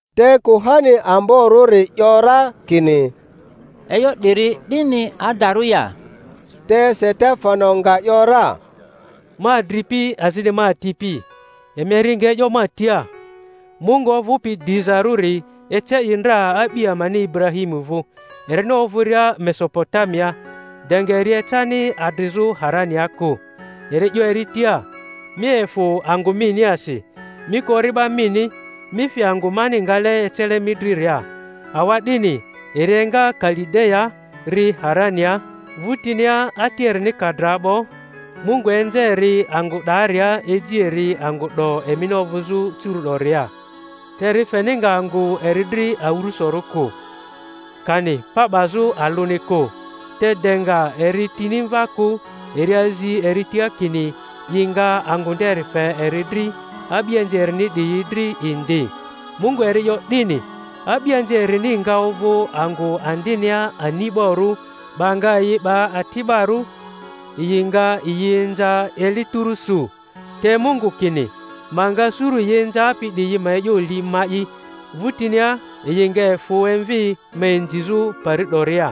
Te kuhani amborᴜri 'yo ra kini, E'yo 'diri 'dini adarᴜ ya? Te Setefano nga 'yo ra: Ma adripi azini ma atipi, emi eri nga e'yo ma tia. Mungu ovᴜpi dizarᴜri ece i ndra a'bi amani Iburahimu vᴜ, erini ovᴜria Meso-potamiaa, de nga eri ecani adrizᴜ Harania kᴜ, eri 'yo eri tia, Mi efᴜ angᴜ miniasi, mi kᴜ ori'ba mini, mi fi angᴜ mani ngale ecele mi driria. Awa'dini eri enga Kalideyaa, ri Harania. Vᴜtinia ati erini ka dra 'bo, Mungu enze eri angᴜ 'daria, eji eri angᴜ 'do emini ovᴜzᴜ curu'doria; te eri feni nga angᴜ eri dri awᴜrᴜsorᴜ kᴜ, kani pa 'bazᴜ alᴜni kᴜ, te de nga eri tini mva kᴜ eri azi eri tia kini i nga angᴜ nderi fe eri dri, a'bianzi erini 'diyi dri indi. Mungu eri 'yo 'dini, a'bianzi erini nga ovᴜ angᴜ andinia ani'barᴜ, 'ba nga yi 'ba ati'barᴜ, yi nga yi inza eli tᴜrᴜ su. Te Mungu kini, Ma nga suru yi inzapi 'diyi na e'yo li ma'i, vᴜtinia yi nga efᴜ emvi ma inzizᴜ pari 'doria.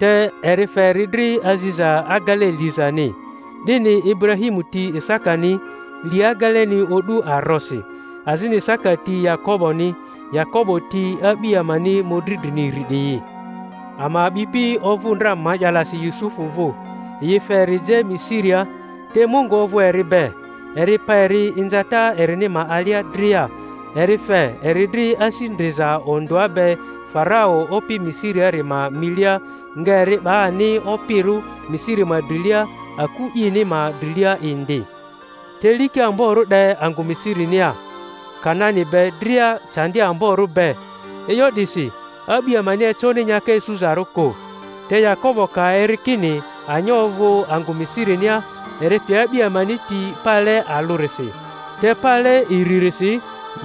Te eri fe eri dri aziza agele lizani. 'Dini Ibura-himu ti Isakani, li ageleni o'du arosi; azini Isaka ti Yakoboni, Yakobo ti a'bi amani mᴜdri drini iri 'diyi. Ama a'bipi ovᴜ ndra ma'yalasi Yusufu vᴜ, yi fe eri je Misiria; te Mungu ovᴜ eri be, eri pa eri inzata erini ma alia dria, eri fe eri dri asi ndriza ondᴜa be Farau opi Misiriari ma milia, nga eri 'ba ani opirᴜ Misiri ma drilia, aku ini ma drilia indi. Te liki amborᴜ 'de angᴜ Misirinia Kanani be dria candi amborᴜ be, e'yo 'disi a'bi amani econi nyaka isuzarᴜ kᴜ. Te Yakobo ka eri kini anya ovᴜ angᴜ Misirinia, eri pe a'bi amani ti pale alᴜrisi. Te pale iririsi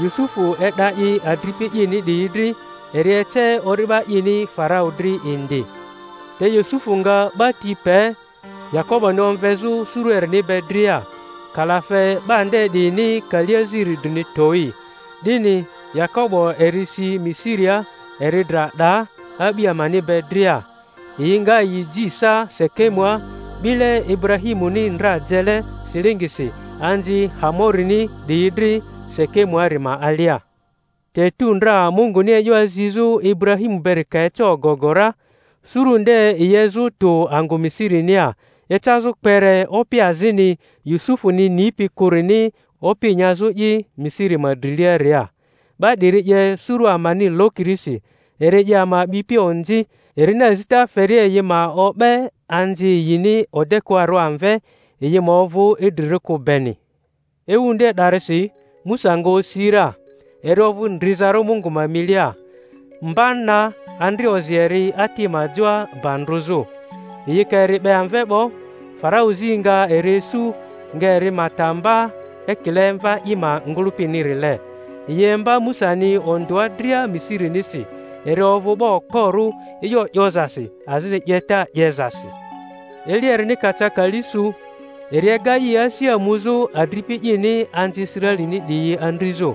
Yusufu e'da i adripi ini 'diyi dri, eri ece ori'ba ini Farau dri indi. Te Yusufu nga 'ba ti pe Yakoboni omvezᴜ suru erini be dria, kalafe 'ba nde 'diyini kali aziri drini towi; 'dini Yakobo eri si Misiria. Eri dra 'daa, a'bi amani be dria, yi nga yi ji sa Sekemua, 'bile Iburahi-muni ndra jele silingisi anzi Hamo-rini 'diyi dri Sekemuari ma alia. Te etu ndra Munguni e'yo azizᴜ Iburahimu beri ka eca ogogo ra, suru nde yi ezᴜ tᴜ angᴜ Misirinia, ecazᴜ kpere opi azini Yusufuni nipi kᴜrini opi nyazᴜi Misiri ma driliaria. 'Ba 'diri 'ye suru amani lokirisi, eri 'ye ama a'bipi onzi erini azita feria yi ma o'be anzi yini odekᴜarᴜ amve, yi ma ovᴜ idrirᴜ kᴜ beni. Ewu nde 'darisi Musa nga osi ra, eri ovᴜ ndrizarᴜ Mungu ma milia. Mba na andri ozi eri ati ma joa ba ndrᴜzᴜ; yi ka eri 'be amve 'bo, Faran zi nga eri isu, nga eri ma ta mba ekile mva i ma ngᴜlᴜpinirile. Yi imba Musani ondᴜa dria Misirinisi; eri ovᴜ 'ba okporᴜ e'yo 'yozasi azini 'yeta 'yezasi. Eli erini ka ca kali su, eri ega i asia muzᴜ adripi ini anzi Israelini 'diyi andrizᴜ.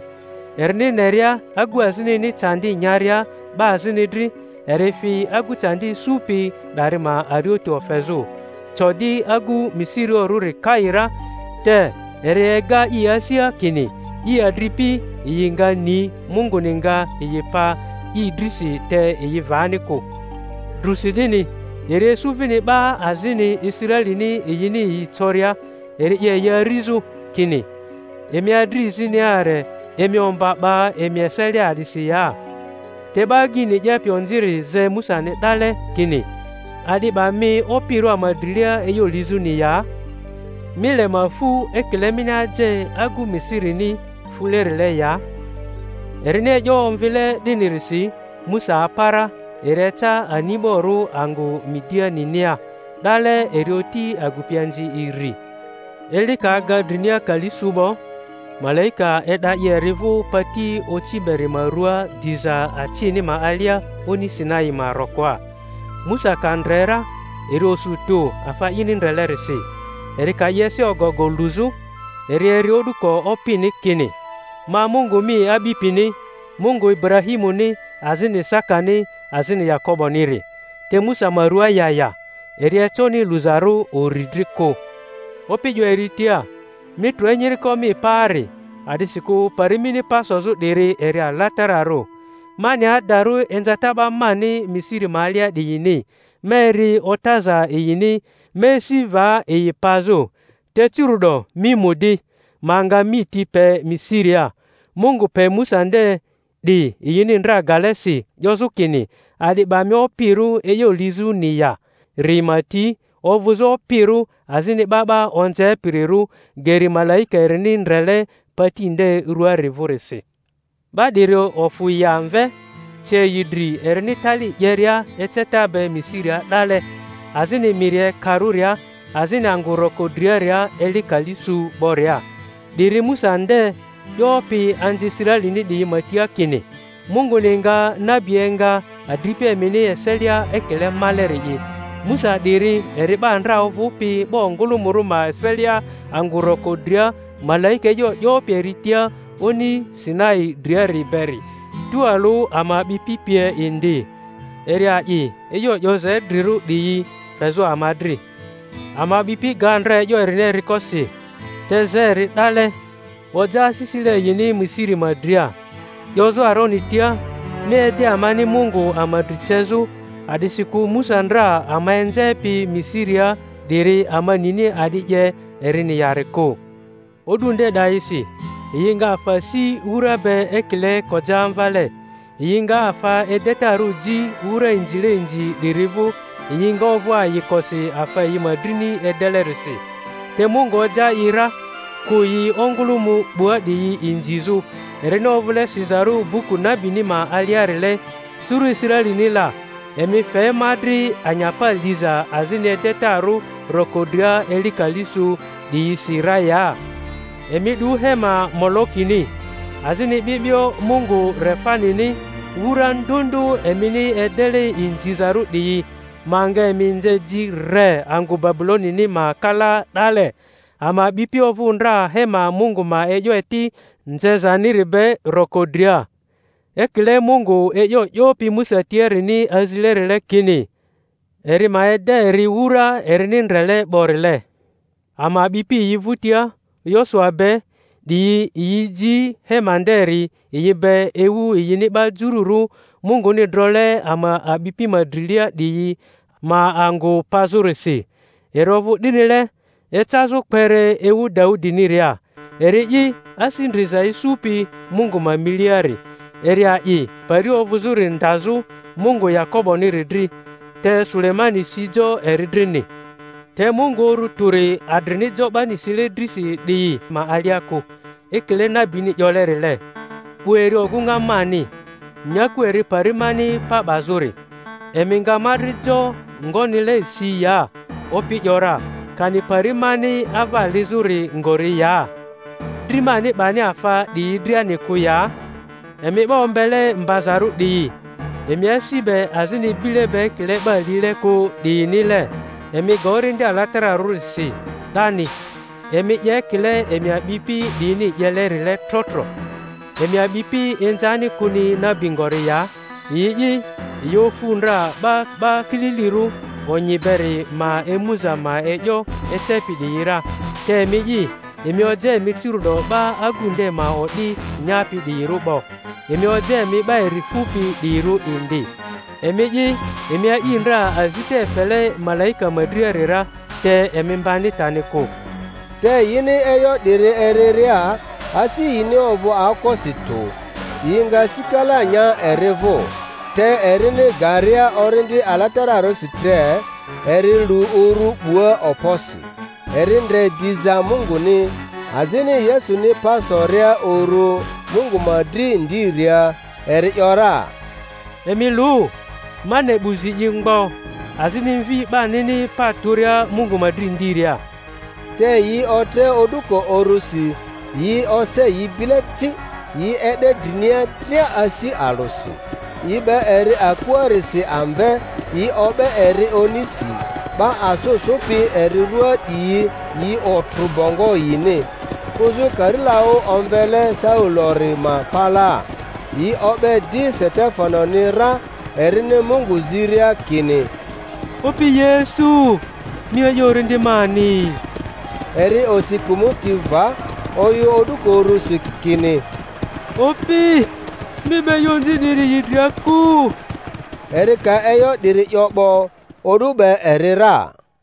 Erini neria agu azinini candi nyaria 'ba azini dri, eri fi agu candi isupi 'dari ma arioti ofezᴜ, co di agu Misirioᴜrᴜri kai ra. Te eri ega i asia kini i adripi yi nga ni Munguni nga yi pa i drisi, te yi vani kᴜ. Drᴜsi 'dini eri isu vini 'ba azini Israelini yini yi coria, eri 'ye yi arizᴜ, kini, Emi adrizini are, emi omba 'ba emi eselia a'disi ya? Te 'ba agyini 'yepi onziri ze Musani 'dale, kini, A'di 'ba mi opirᴜ ama drilia e'yo lizᴜni ya? Mi le ma fᴜ ekile mini aje agu Misirini fulerile ya? Erini e'yo omvile 'dinirisi Musa apa ra, eri eca ani'borᴜ angᴜ Midianinia. 'Dale eri oti agupianzi iri. Eli ka aga drinia kali su 'bo, malaika e'da i eri vᴜ pati oci beri ma rᴜaa diza acini ma alia oni Sinai ma rokoa. Musa ka ndre ra eri osu tᴜ afa ini ndrelerisi; eri ka i ese ogogo luzᴜ, eri eri o'duko Opini kini, Ma Mungu mi a'bipini, Mungu Iburahimuni, azini Isakani, azini Yakoboniri. Te Musa ma rua ya ya, eri econi luzarᴜ uri dri kᴜ. Opi 'yo eri tia, Mi trᴜ enyiriko mi paari, a'disikᴜ pari mini pa sozᴜ 'diri eri alatararᴜ. Ma ne adarᴜ inzata 'ba mani Misiri ma alia 'diyini, ma eri otaza yini, ma esi va yi pazᴜ. Te curu'do mi mu di, ma nga mi ti pe Misiria. Mungu pe Musa nde 'di yini ndra gale si 'yozᴜ kini, A'di 'ba mi opirᴜ e'yo lizᴜni ya?-ri ma ti ovᴜzᴜ opirᴜ azini 'ba 'ba onzepirirᴜ, geri malaika erini ndrele pati nde ruaari vᴜrisi. 'Ba 'diri ofᴜ yi amve, ce yi dri erini tali 'yeria eceta be Misiria 'dale, azini miri Ekarᴜria, azini angᴜ roko driaria eli kali su 'boria. 'Diri Musa nde 'yopi anzi Israelini 'diyi ma tia kini, Munguni nga nabi enga adripi emini eselia ekile male-ri'i. Musa 'diri eri 'ba ndra ovᴜpi 'ba ongᴜlᴜmᴜrᴜ ma eselia angᴜ roko dria malaika e'yo 'yopi eri tia oni Sinai driari beri, tualᴜ ama a'bipi pie indi; eri a'i e'yo 'yoza idrirᴜ 'diyi fezᴜ ama dri. Ama a'bipi ga ndra e'yo erini eriko si, te ze eri 'dale, oja asisile yini Misiri ma dria, 'yozᴜ Aroni tia, Mi ede amani mungu ama dri cezᴜ; a'disikᴜ Musa ndra ama enzepi Misiria 'diri, ama nini a'di 'ye erini yari kᴜ. O'du nde 'dayisi yi nga afa si wura be ekile kojamvale, yi nga afa edetarᴜ ji wura inzile inzi 'diri vᴜ, yi nga ovᴜ ayikosi afa yi ma drini edelerisi. Te Mungu oja i ra, kᴜ yi ongᴜlᴜmᴜ 'bua 'diyi inzizᴜ, erini ovᴜle sizarᴜ buku nabini ma aliarile: Suru Israelini la, emi fe ma dri anyapa liza azini edetarᴜ roko dria eli kali su 'diyisi ra ya? Emi 'du hema Molokini, azini 'bi'bio mungu Refanini, wura ndᴜ ndᴜ emini edele inzizarᴜ 'diyi; ma nga emi nze ji re angᴜ Babulonini ma kalaa 'dale. Ama a'bipi ovᴜ ndra hema Mungu ma e'yo eti nzezaniri be roko dria, ekile Mungu e'yo 'yopi Musa tiarini azilerile, kini eri ma ede eri wura erini ndrele 'borile. Ama a'bipi yi vᴜtia Yosua be 'diyi yi ji hema nderi yi be ewu yini 'ba Jururᴜ Munguni drole ama a'bipi ma drilia 'diyi ma angᴜ pazᴜrisi. Eri ovᴜ 'dinile ecazᴜ kpere ewu Daudiniria, eri'i asi ndriza isupi Mungu ma miliari, eri a'i pari ovᴜzᴜri ndazᴜ Mungu Yakoboniri dri. Te Sulemani si jo eri drini. Te Mungu Uru Tᴜri adrini jo 'bani sile drisi 'diyi ma alia kᴜ; ekile nabini 'yolerile, 'Bu eri ogᴜŋa mani, nyaku eri pari mani pa 'bazᴜri. Emi nga ma dri jo ngonile si ya, Opi ‘yora, kani pari mani ava lizᴜri ngori ya? Dri mani 'bani afa 'diyi driani kᴜ ya? Emi 'ba ombele mbazarᴜ 'diyi, emi asi be azini bile be ekile 'ba lile kᴜ 'diyinile, emi ga Orindi Alatara-rᴜri si 'dani. Emi 'ye ekile emi a'bipi 'diyini 'yelerile tro tro. Emi a'bipi inzani kᴜni nabi ngori ya? Yi'i, yi ofu ndra 'ba 'Ba Kililirᴜ Onyi beri ma emuza ma e'yo ecepi 'diyi ra, te emi'i, emi oja emi curu'do 'ba Agu nde ma o'di nyapi 'diyirᴜ 'bo, emi oja emi 'ba eri fupi 'diyirᴜ indi; emi'i, emi a'i ndra azita efele malaika ma driari ra, te emi mbani tani kᴜ. Te yini e'yo 'diri eriria, asi yini ovᴜ aokosi tᴜ, yi nga sikala nya eri vᴜ. Te erini garia Orindi Alatararᴜrisi tre, eri lu uru 'bua okposi, eri ndre diza Munguni, azini Yesuni pa soria uru Mungu ma dri ndiria; eri ‘yora, Emi lu, ma ne 'bu zi i mgbo, azini Mvi 'banini pa tᴜria Mungu ma dri ndiria. Te yi otre o'duko urusi, yi ose yi bile ci, yi e'de drinia dria asi alᴜsi. Yi 'be eri akuarisi amve, yi o'be eri onisi; 'ba asᴜ sᴜpi eri ruaa 'diyi yi otrᴜ bongo yini, kᴜzᴜ karilaᴜ omvele Saulori ma palaa. Yi o'be di Setefanoni ra erini Mungu ziria kini, Opi Yesu, mi a'i orindi mani. Eri osi kᴜmᴜti va, oyᴜ o'duko urusi kini, Opi, mi 'ba e'yo onzi 'diri yi dria kᴜ. Eri ka e'yo 'diri 'yo 'bo, o'du 'be eri ra.